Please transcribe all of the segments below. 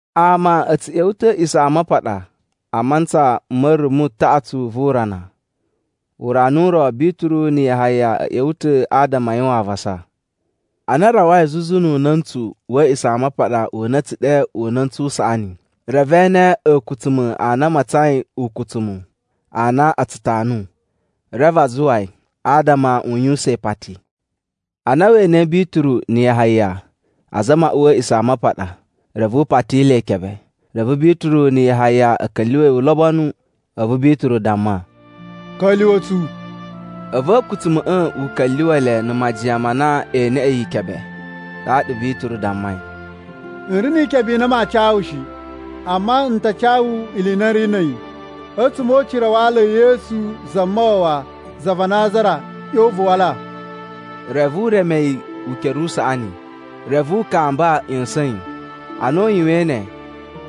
Ama a̱ tsu ꞌya̱wa̱ ta̱ a̱ A̱a̱ꞌisamapaɗa a mantsa ma̱ rumu taꞌatsu vu urana. Urana u ro, Bituru na̱ Yahaya a̱ ꞌya̱wa̱ ta̱ adama a yuwan avasa. Ana a rawai zuzu nu una̱ntsu wa̱ A̱a̱ꞌisamapaɗa u na a̱ tsu ɗe Una̱ntsu u Saꞌani reve e ene a̱a̱kutsuma̱ a na a matsain ukutsumu a na a tsu tanu, reve a zuwa yi, adama u yuwusan ipati. Ana we enei Bituru na̱ Yahaya azama a uwa a̱ A̱a̱ꞌisamapaɗa, reve u pati le ikebe. Reve Bituru na̱ Yahaya a̱ ka̱lyuwa̱ yi ulobonu, a̱vu Bituru damma, “Ka̱lyuwa̱ tsu!” A̱vu a̱a̱kutsuma̱ꞌa̱ u ka̱lyuwa̱ le na̱ majiyan ma na ee neꞌe yi ikebe. Ɗaɗa Bituru dammai, “N ri ni ikebe i na maa ca wu shi. Amma n ta ca wu ili i na n ri na̱ a̱yi, a̱tsuma̱ o ucira wa ala e Yesu Zamawawa za va Nazara ꞌyon vu wala.” Reve u reme yi ukere usaꞌani, reve u kamba ꞌya̱sa̱n yi. Ana u yuwain ne,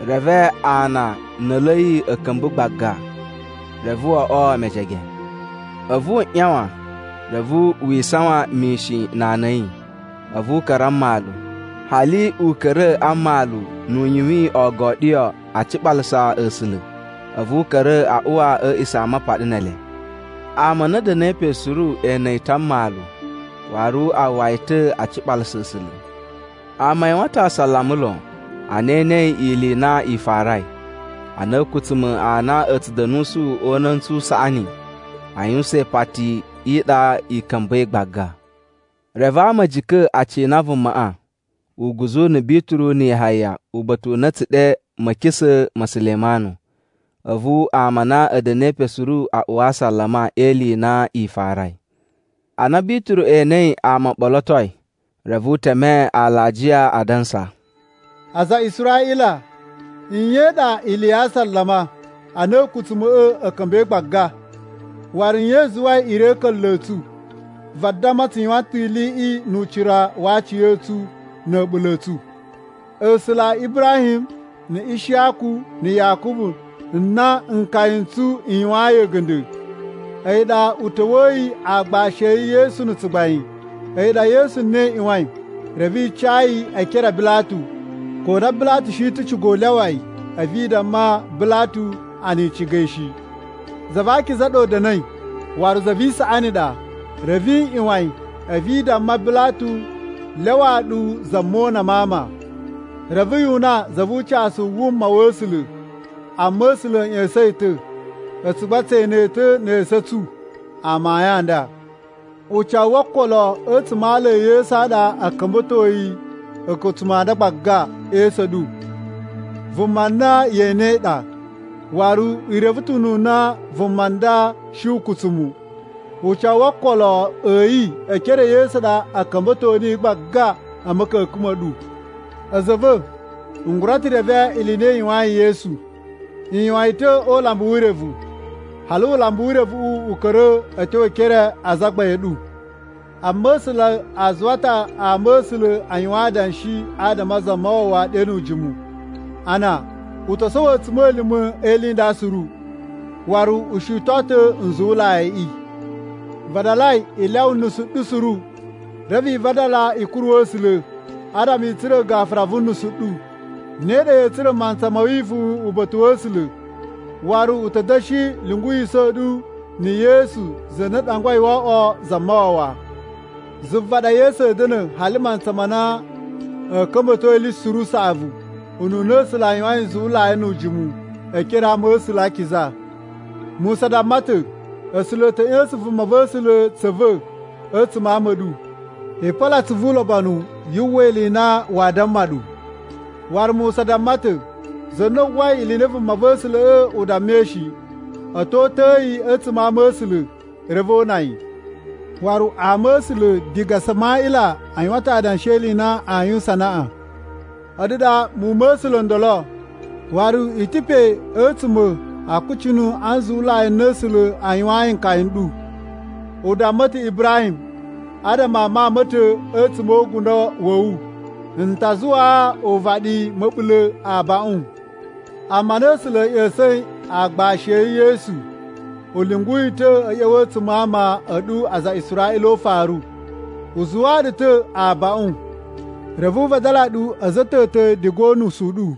reve ana na̱ a̱lu a̱ yi a̱ ka̱mba̱ gbaga, reve o oꞌwo mejege. A̱vu wu ꞌyawan, reve wi isawan mishin na ana a̱ yi. A̱vu u ka̱ra̱ a mmalu. Hali u ka̱ra̱ a mmalu nu u yuwin ogoɗiyo a ciɓalasa A̱sula̱. A̱vu u ka̱ra̱ a uwa a̱ A̱a̱ꞌisamapaɗa ne ele. Ama a na a̱ da̱na̱i pe suru e ene yi ta̱ a mmalu waru a uwwa yi ta̱ a ciɓalasa A̱sula̱. Ama a yuwan ta̱ asalama lon, ana e enei ili i na i farai, a na a̱a̱kutsuma̱ a na a̱ tsu da̱nusu o Una̱ntsu u Saꞌani a yuwusan ipati i ɗa ka̱mba̱i gbaga. Reve ama a̱ jika̱ a cina vumaꞌa uguzu na̱ Bituru na̱ Yahaya uba̱ta̱ u na a̱ tsu ɗe Ma̱kisa̱ ma̱ Sulemanu. A̱vu ama a na a̱ da̱na̱i pe suru a uwa asalama e ili i na i farai. Ana Bituru enei ama o ɓolotoi reve u teme alajiya adansa, “Aza a Israꞌila, nye i ɗa ili ya asalama a na a̱a̱kutsuma̱ꞌa̱ u ka̱mba̱i gbaga? Waru nye i zuwai i ri a̱ a̱ka̱nla̱ a̱ tsu, vadamma tsu yuwan ta̱ iliꞌi nu ucira wa aciya̱tsu na̱ a̱ɓula̱ a̱ tsu? A̱sula̱ a Ibrahim na̱ Ishiyaku na̱ Yakubu n na nkaya n tsu n yuwayin a̱ga̱nda̱, a̱yi ɗa u ta̱wa̱yi aagbashi a̱ yi Yesu na̱ tsugbain. A̱yi ɗa Yesu na i ꞌyuwain, reve i ca yi e ekere a Bilatu, ko na Bilatu shi ta̱ ciga u lyawa yi. A̱vu i damma Bilatu a na i ciga yi shi. Za va akiza ɗa u da̱na̱i, waru za vi isaꞌani ɗa, reve i ꞌyuwan yi a̱vu i damma Bilatu lyawaa ɗu za mona ma ama. Reve yu una za vu ucasu u wuma wa̱ A̱sula̱, amma A̱sula̱ a̱ ꞌya̱sa̱n yi ta̱. A̱tsu gba tse ene ta̱ ne esu a̱ tsu amayun a nda. Ucawu wo okolo a̱tsuma̱ a ala e Yesu ɗa a̱ ka̱mba̱toi a̱a̱kutsuma̱ a nda gbaga e esu a̱ ɗu. Vuma na ye enei ɗa, waru i reve ta̱ ununa vuma nda shi ukutsumu. Ucawu wo okolo a̱ yi e ekere e Yesu ɗa a̱ ka̱mba̱to niyi gbaga a̱ ma̱ka̱ka̱n ma̱ ɗu. “A̱za̱ a̱ va̱, n gura ta̱ reve ili i na i yuwayin Yesu, i yuwan yi ta̱ o ulambu wu urevu, hali ulambu wu urevuꞌu u ka̱ra̱ a̱ tyo e ekere a azagbain a̱ ɗu. Amma A̱sula̱ a zuwa ta̱ ama̱sula̱ a yuwan adanshi adama a Zamawawa ɗe nu ujimu, a na u to sowo a̱tsuma̱lima̱ e ili i nda suru, waru u shiton ta̱ nzuwulaiꞌi. Vadalai i lyawa unusu u ɗu suru, reve i vadala i kuru A̱sula̱, adama i tsura̱ gafura vu unusu u ɗu. Ne ɗa ya̱a̱ tsura̱ mantsa ma̱ wivuwun uba̱ta̱ wa̱ A̱sula̱, waru u ta̱ da̱shi lyunguwisa̱ ɗu na̱ Yesu za na u ɗangwai wo oꞌwo Zamawawa. Zuva ɗa Yesu a̱a̱ da̱na̱ hali mantsa ma na a̱a̱ ka̱mba̱to ili suru usaꞌavu, ununa A̱sula̱ a yuwain nzuwulai nu ujimu, e ekere a ama̱sula̱ a akiza. Musa damma ta̱, ‘A̱sula̱ a̱ ta̱ ꞌya̱sa̱n vumava̱sula̱ tsa̱ va̱ a̱tsuma̱ a ama a̱ ɗu. I polo atsuvu ulobonu yu uwwa ili i na waa damma ɗu.’ Waru Musa damma ta̱, ‘Za na uwwai ili i na vumava̱sula̱ꞌa̱ u dammai shi a̱ to uta̱a̱ yi a̱tsuma̱ a ama a̱ A̱sula̱, reve o una yi.’ “Waru ama̱sula̱ diga Samaꞌila a yuwan ta̱ adanshi e ili i na aa yuwusan anaꞌan. A̱ɗu ɗa muwun ma ama̱sula̱ o ndolo, waru i ta̱ pe a̱tsuma̱ a akucunu a nzuwulai n na A̱sula̱ a yuwayin nkaya n ɗu. U damma ta̱ Ibrahim, ‘Adama a mawun ma̱ ta̱ a̱tsuma̱ o ugundo wa̱ wu n ta zuwaa uvaɗi ma̱ɓula̱ abaꞌun.’ Amma ana A̱sula̱ a̱ ꞌya̱sa̱in aagbashi a̱ yi Yesu, u lyungu yi ta̱ a̱ ꞌya̱wa̱ a̱tsuma̱ a ama a̱ ɗu aza a Israꞌila o ufaru, u zuwaa ɗu ta̱ abaꞌun, reve u vadala ɗu a̱za̱ a̱ ta̱ ta̱ diga o unusu u ɗu.”